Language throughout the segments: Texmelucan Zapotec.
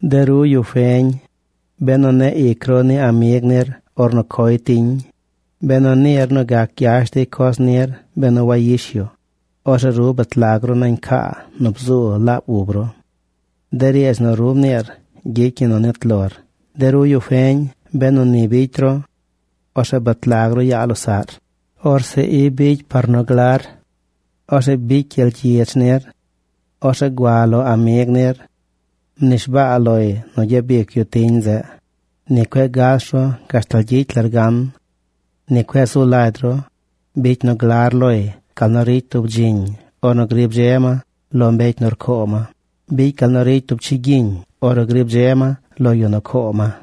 De ru, yu feñ, benu neꞌ ic ru ni amig nir ornu coy tiñ, benu niir nu gac gyash dey coz nir benu wayish yu, orzeꞌ ru bet lag ru nañ caa nu bzu laab ub ru. De riidz nu ru mniir gyicy ñi nu nit lor. De ru, yu feñ, benu ni bicy ru, orzeꞌ bet lag ru yaa losaꞌr. Orzeꞌ i bicy par nu glar. Orzeꞌ bicy gyel gyidz nir. Orzeꞌ gua lo amig nir. Mnishbaa loy nu gyabic yu tiñ zeꞌ. Ni cueꞌ gas ru gashtal gyicy lar gan. Ni cueꞌ zu lagy ru. Bicy nu glar loy gal nu ricy tub dziñ ornu grib dze ma lo mbecy nu rcoo ma. Bicy gal nu ricy tub chigyiñ ornu grib dze ma lo yu nu coo ma.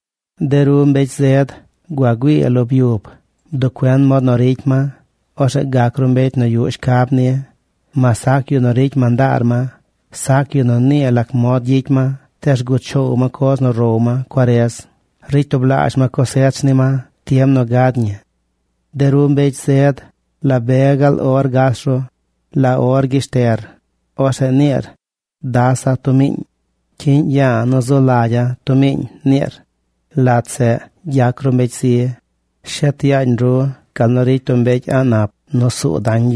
De ru, mbecy zed, gua güii lo byub. Bduꞌ cuen mod nu ricy ma. Orzeꞌ gac ru mbecy nu yuꞌ shcab ni. Mas sac yu nu ricy mandaar ma, sac yu nu nii lac mod gyicy ma, tees rguꞌ choow ma coz nu row ma cuarez. Ricy tublaazh ma cosech ni ma tiem nu gad ñi. De ru, mbecy zed, ¿la be gaal or gas ru? ¿La or gyeshter? Orzeꞌ niir: “Dasa̱ tub miiñ. Cyiꞌñ ya̱a̱ nu zu lagya̱ tub mniiñ”, niir. Lat zeꞌ gyac ru mbecy zi. Shet yaañ ru, gal nu ricy tub mbecy a̱ꞌ nap nu nuu suu dañ.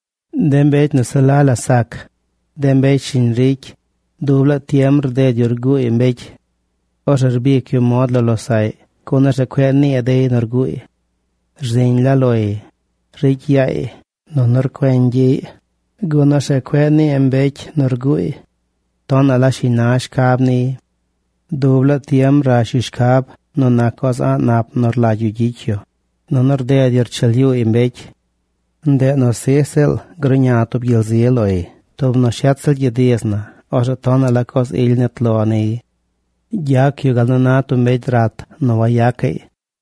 De mbecy nu se la la sac, de mbecy shiñ ricy, dub laa tiem rded yu rguuy mbecy. Orzeꞌ rbic yu mod lo losaꞌy gun orzeꞌ cueꞌ nii dey nu rguuy. Rziñ la loy. Ricy yaay. Nunu rcueñ gyiꞌy, gun orzeꞌ cueꞌ nii mbecy nu rguuy. Tonaꞌ la shiñ na shcab niy. Dub laa tiem rash yu shcab nu nac coz a̱ꞌ nap nu rlagy yu gyicy yu. Nunu rded yu rcheel yuuy mbecy. Ndeꞌ nu sij ziꞌl gruꞌña tub gyel zi loy. Tub nu shet ziꞌl gyid iz na, orzeꞌ tonaꞌ la coz ily nit lo niy. Gyac yu gal nu na tub mbecy rat nu wayacaꞌy.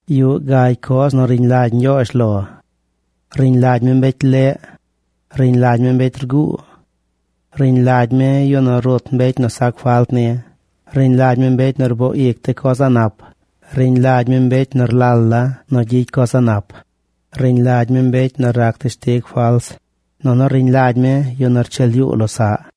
Yuꞌ gagy coz nu riñ lagy Ñgyoozh lo. Riñ lagy mi mbecy leꞌ. Riñ lagy mi mbecy rguu. Riñ lagy mi yu nu rut mbecy nu sac falt ni. Riñ lagy mi mbecy nu rboo ic de coz a̱ꞌ nap. Riñ lagy mi mbecy nu rlal la nu gyicy coz a̱ꞌ nap. Riñ lagy mi mbecy nu rac teshtig fals. Nunu riñ lagy mi yu nu rcheel yuu losaꞌ.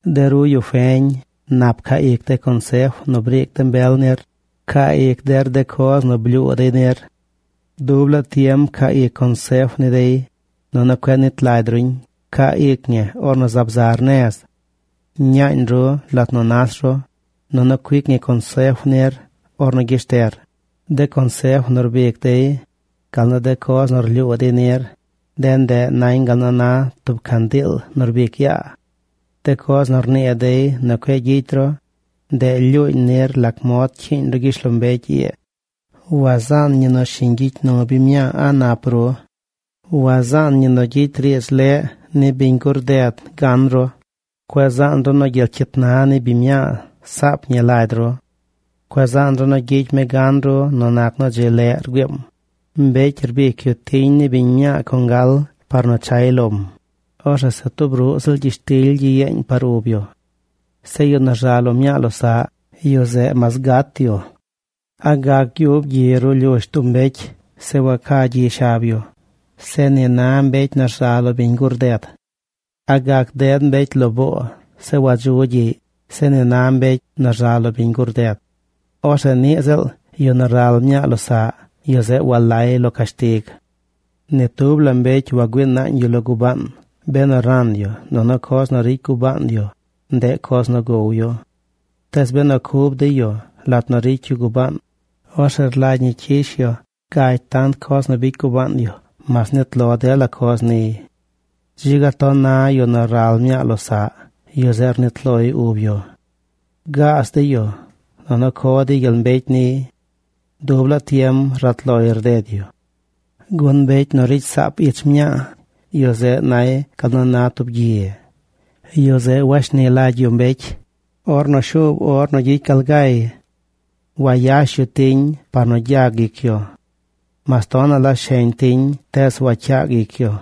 De ru, yu feñ, nap pcaa ic de consef nu briic de mbel nir. Pcaa ic der de coz nu blyuu dey nir. Dub laa tiem pcaa ic consef ni dey, nunu cueꞌ nit lagy ruñ. Pcaa ic ñi ornu zaab zar nez. Ñaañ ru lat nu nas ru, nunu cuic ñi consef nir ornu gyeshter. De consef nu rbic dey, gal nu de coz nu rlyuu dey nir, de ndeꞌ nañ gal nu na tub candiil nu rbic yaa. De coz nu rnii dey nu cueꞌ gyicy ru, ndeꞌ lyuuñ nir lac mod cyiiñ ru gyishlombecy ii. Wazaan ñi nu shiñ gyicy nu biñ mñaa a̱ꞌ nap ru. Wazaan ñi nu gyicy riidz leꞌ ni biñ gur ded gan ru. Cueꞌ zaan ru nu gyel cyit na ni biñ mñaa saap ñi lagy ru. Cueꞌ zaan ru nu gyicy mi gan ru nu nac nu dzi leꞌ rgüiim. Mbecy cuic yu tiñ ni biñ mñaa congal par nu chay lom. Orzeꞌ se tub ruꞌ ziꞌl gyishtily gyeeñ par ub yu. Zeꞌ yu nu rza lo mñaa losaꞌ, yu zeꞌ mas gat yu. ¿A gac gyub ruꞌ gyi ruꞌ lyush tub mbecy, zeꞌ waca gyi shab yu? Zeꞌ ni na mbecy nu rza lo biñ gur ded. ¿A gac ded mbecy lo boo, zeꞌ wadzu gyiꞌy? Zeꞌ ni na mbecy nu rza lo biñ gur ded. Orzeꞌ niꞌ ziꞌl yu nu ral mñaa losaꞌ, yu zeꞌ walay lo cashtig. Ni tub la mbecy wagüii naañ yu lo gubaan benu ran yu nunu coz nu ricy gubaan yu, ndeꞌ coz nu gow yu. Tees benu cub dey yu lat nu ricy yu gubaan, orzeꞌ rlagy ñi cyish yu gagy tant coz nu bicy gubaan yu mas nit lo dela coz niy. ¡Dzi ga ton na yu nu ral mñaa losaꞌ! Yu zeꞌ rnit loy ub yu. Gaaz dey yu, nunu co dey gyel mbecy niy. Dub laa tiem rat loy rded yu. Gun mbecy nu ricy saap ich mñaay, yu zeꞌ nay gal nu na tub gyi. Yu zeꞌ washni lagy yu mbecy ornu shuub or nu gyicy yu gal ga. Wayash yu tiñ par nu gyag ic yu. Mas tonaꞌ la sheñ tiñ, tees wacyaag ic yu.